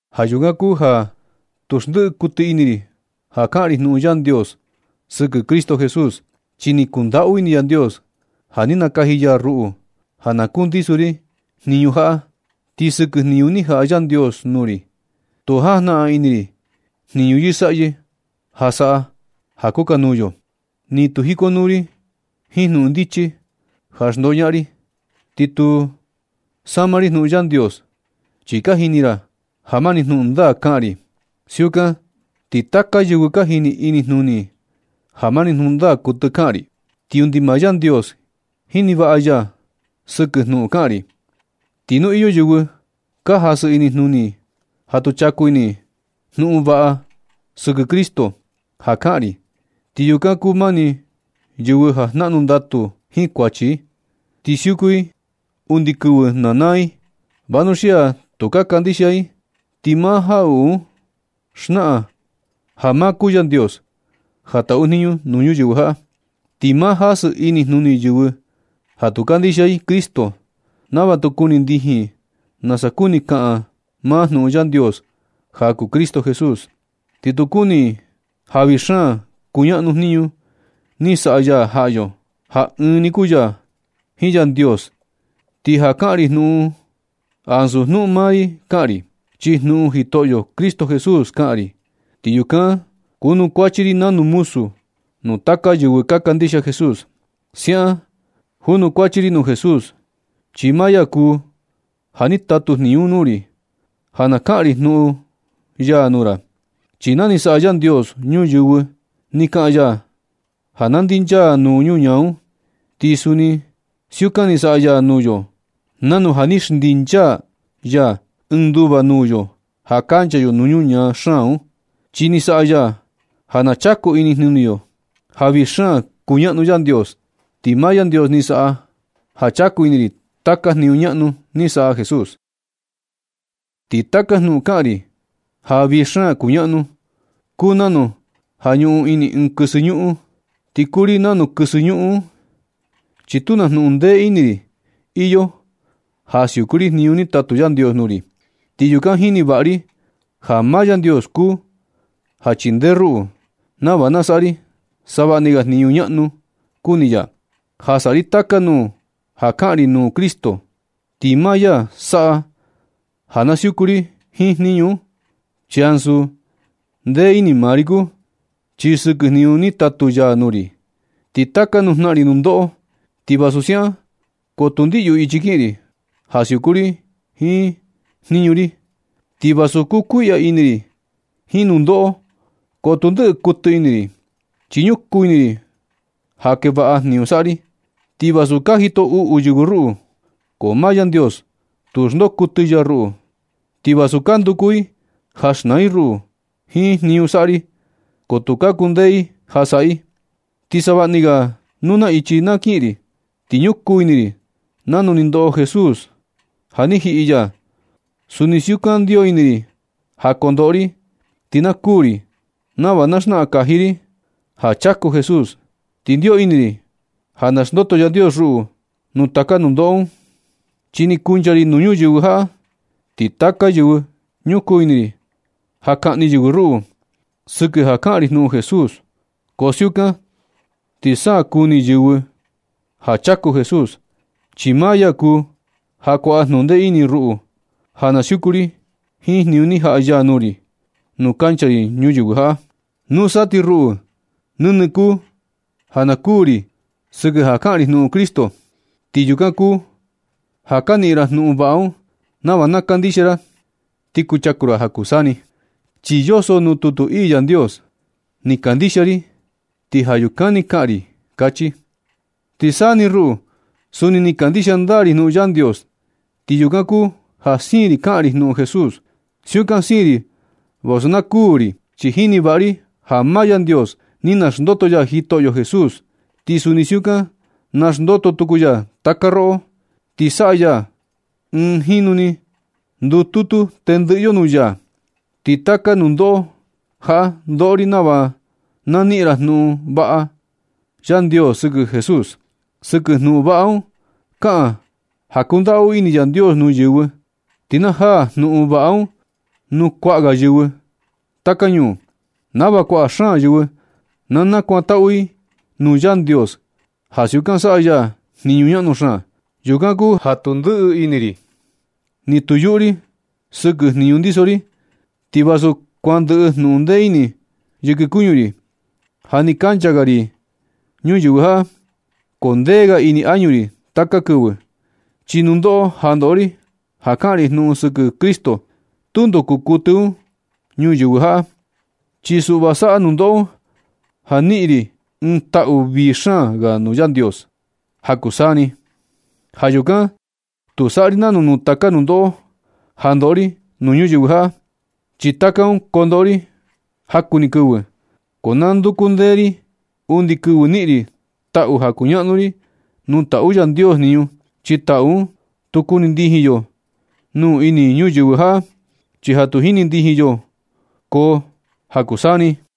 Ja yukan kuu ja tu xndiꞌi kuɨtɨ ini ri ja kaꞌan ri jnuꞌun Yandios sɨkɨ Cristo Jesús. Chi ni kundaꞌu ini Yandios ja ni nakaji ya ruꞌu ja na kundiso ri jniñu jaꞌa. Ti sɨkɨ jniñu ni jaꞌa Yandios nuu ri, tu jajnaꞌan ini ri jniñu yɨsaꞌyɨ ja saꞌa ja kukanuu yo, ni tu jikonuu ri jiin jnuꞌun ndichi ja xndoñaꞌan ri, ti ni tu sama ri jnuꞌun Yandios. Chi ka jini ra ja mani jnuꞌun ndaa kaꞌan ri. Siukan ti taka yɨvɨ ka jini inijnuni i ja mani jnuꞌun ndaa kuɨtɨ kaꞌan ri. Ti undi maa Yandios jini vaꞌa ya sɨkɨ jnuꞌun kaꞌan ri. Ti nu iyo yɨvɨ ka jasɨ inijnuni i ja tu chaku ini i jnuꞌun vaꞌa sɨkɨ Cristo ja kaꞌan ri, ti yukan kuu mani yɨvɨ ja jnaꞌnu ndatu jiin kuachi, ti siuku i undi kɨvɨ na naa i. Vanuxia tu ka kandixia i ti maa jaꞌuꞌu un xnaꞌan ja maa kuu Yandios ja taꞌu jniñu nuu ñuyɨvɨ jaꞌa, ti maa jasɨ inijnuni yɨvɨ ja tu kandixia i Cristo, nava tu kuni ndijin i nasa kuni kaꞌan maa jnuꞌun Yandios ja kuu Cristo Jesús, ti tu kuni i ja vii xaan kuñaꞌnu jniñu ni saꞌa ya jaꞌa yo, ja ɨɨn ni kuu ya jiin Yandios. Ti ja kaꞌan ri jnuꞌun un, ansu jnuꞌun maa ri kaꞌan ri, chi jnuꞌun Jitoꞌyo Cristo Jesús kaꞌan ri. Ti yukan junukuachi ri nanu muzu nuu taka yɨvɨ ka kandixia Jesús. Siaꞌan junukuachi ri nuu Jesús, chi maa ya kuu ja ni tatu jniñu un nuu ri ja na kaꞌan ri jnuꞌun ya nuu ra. Chi na ni saꞌa Yandios ñuyɨvɨ ni kaꞌan ya ja na ndinchaa nuu ñuñaa un. Ti suni siukan ni saꞌa ya nuu yo nanu ja ni xndinchaa ya ɨɨn nduva nuu yo ja kancha yo nuu ñuñaa xaan un. Chi ni saꞌa ya ja na chaku inijnuni yo ja vii xaan kuñaꞌnu Yandios. Ti maa Yandios ni saꞌa ja chaku ini ri taka jniñu ñaꞌnu ni saꞌa Jesús. Ti taka jnuꞌun kaꞌan ri ja vii xaan kuñaꞌnu, kuu nanu ja ñuꞌun ini ɨɨn kɨsɨ ñuꞌun, ti kuu ri nanu kɨsɨ ñuꞌun un, chi tu na junꞌun ndee ini ri iyo ja siuku ri jniñu ni tatu Yandios nuu ri. Ti yukan jini vaꞌa ri ja maa Yandios kuu ja chindee ruꞌu, nava na saꞌa ri savaꞌni ga jniñu ñaꞌnu kuni ya, ja saꞌa ri taka nuu ja kaꞌan ri jnuꞌun Cristo. Ti maa ya saꞌa ja na siuku ri jiin jniñu un, chi ansu ndee ini maa ri kuu. Ti sɨkɨ jniñu ni tatu ya nuu ri, ti taka nuu jnaꞌan ri nundoꞌo. Ti vasu siaꞌan, ko tu ndiꞌyu ichi kiꞌin ri ja siuku ri jiin jniñu ri. Ti vasu kukuiꞌya ini ri jiin nundoꞌo, ko tu ndɨꞌɨ kuɨtɨ ini ri, chi ñukuu ini ri ja kee vaꞌa jniñu saꞌa ri. Ti vasu ka jito uꞌu yɨvɨ ruꞌu, ko maa Yandios tu xndoo kuɨtɨ ya ruꞌu. Ti vasu ka nduku i ja xnaa i ruꞌu jiin jniñu saꞌa ri, ko tu ka kundee i ja saꞌa i. Ti savaꞌni ga nuu na ichi na kiꞌin ri, ti ñukuu ini ri nanu ni ndoꞌo Jesús ja ni jiꞌi ya. Suni siukan ndio ini ri ja kondoꞌo ri ti na kuū ri, nava na xnaꞌan kaji ri ja chaku Jesús, ti ndio ini ri ja na naxndoto Yandios ruꞌu nuu taka nundoꞌo un. Chi ni kuncha ri nuu ñuyɨvɨ jaꞌa, ti taka kɨvɨ ñukuu ini ri ja kaꞌni yɨvɨ ruꞌu sɨkɨ ja kaꞌan ri jnuꞌun Jesús. Ko siukan ti sa na kuni yɨvɨ ja chaku Jesús, chi maa ya kuu ja kuaꞌa junꞌun ndee ini ruꞌu ja na siuku ri jiin jniñu ni jaꞌa ya nuu ri nu kancha ri ñuyɨvɨ jaꞌa. Nusa ti ruꞌu, nɨnɨ kuu ja na kuu ri sɨkɨ ja kaꞌan ri jnuꞌun Cristo. Ti yukan kuu ja ka niꞌin ra jnuꞌun vaꞌa un, nava na kandixia ra ti kuchaku ra ja kuu saa ni. Chi yoso nuu tutu ii Yandios: “Ni kandixia ri, ti ja yukan ni kaꞌan ri”, kachi. Ti saa ni ruꞌu, suni ni kandixia ndaa ri jnuꞌun Yandios, ti yukan kuu ja siin ri kaꞌan ri jnuꞌun Jesús. Siukan siin ri vasu na kuu ri, chi jini vaꞌa ri ja maa Yandios ni naxndoto ya Jitoꞌyo Jesús, ti suni siukan naxndoto tuku ya taka roꞌo, ti saꞌa ya ja ɨɨn jinu ni ndututu tendɨꞌɨ yo nuu ya. Ti taka nundoꞌo jaꞌa ndoꞌo ri nava na niꞌin ra jnuꞌun vaꞌa Yandios sɨkɨ Jesús. Ti sɨkɨ jnuꞌun vaꞌa un, kaꞌan ja kundaꞌu ini Yandios nuu yɨvɨ, ti na jaa jnuꞌun vaꞌa un nuu kuaꞌa xaan ga yɨvɨ taka ñuu, nava kuaꞌa xaan yɨvɨ na nakuantaꞌu i nuu Yandios ja siukan saꞌa ya jniñu ñaꞌnu xaan. Yukan kuu ja tu ndɨꞌɨ ini ri, ni tu yuꞌu ri sɨkɨ jniñu ndiso ri. Ti vasu kuan ndɨꞌɨ jnuꞌun ndee ini yɨkɨ kuñu ri ja ni kancha ga ri ñuyɨvɨ jaꞌa, ko kundee ga ini añu ri taka kɨvɨ. Chi nundoꞌo ja ndoꞌo ri ja kaꞌan ri jnuꞌun sɨkɨ Cristo, tundo kuu kuɨtɨ un ñuyɨvɨ jaꞌa, chi suꞌva saꞌa nundoꞌo un ja niꞌin ri ɨɨn taꞌu vii xaan ga nuu Yandios ja kuu taka saa ni. Ja yukan tu saꞌa ri nanu nuu taka nundoꞌo ja ndoꞌo ri nuu ñuyɨvɨ jaꞌa, chi taka un kondoꞌo ri jaku ni kɨvɨ. Ko na nduku ndee ri undi kɨvɨ niꞌin ri taꞌu ja kuñaꞌnu ri nuu taꞌu Yandios jniñu, chi taꞌu un, tu kuni ndijin yo nuu ini ñuyɨvɨ jaꞌa, chi ja tu jini ndijin yo un koo ja kuu taka saa ni.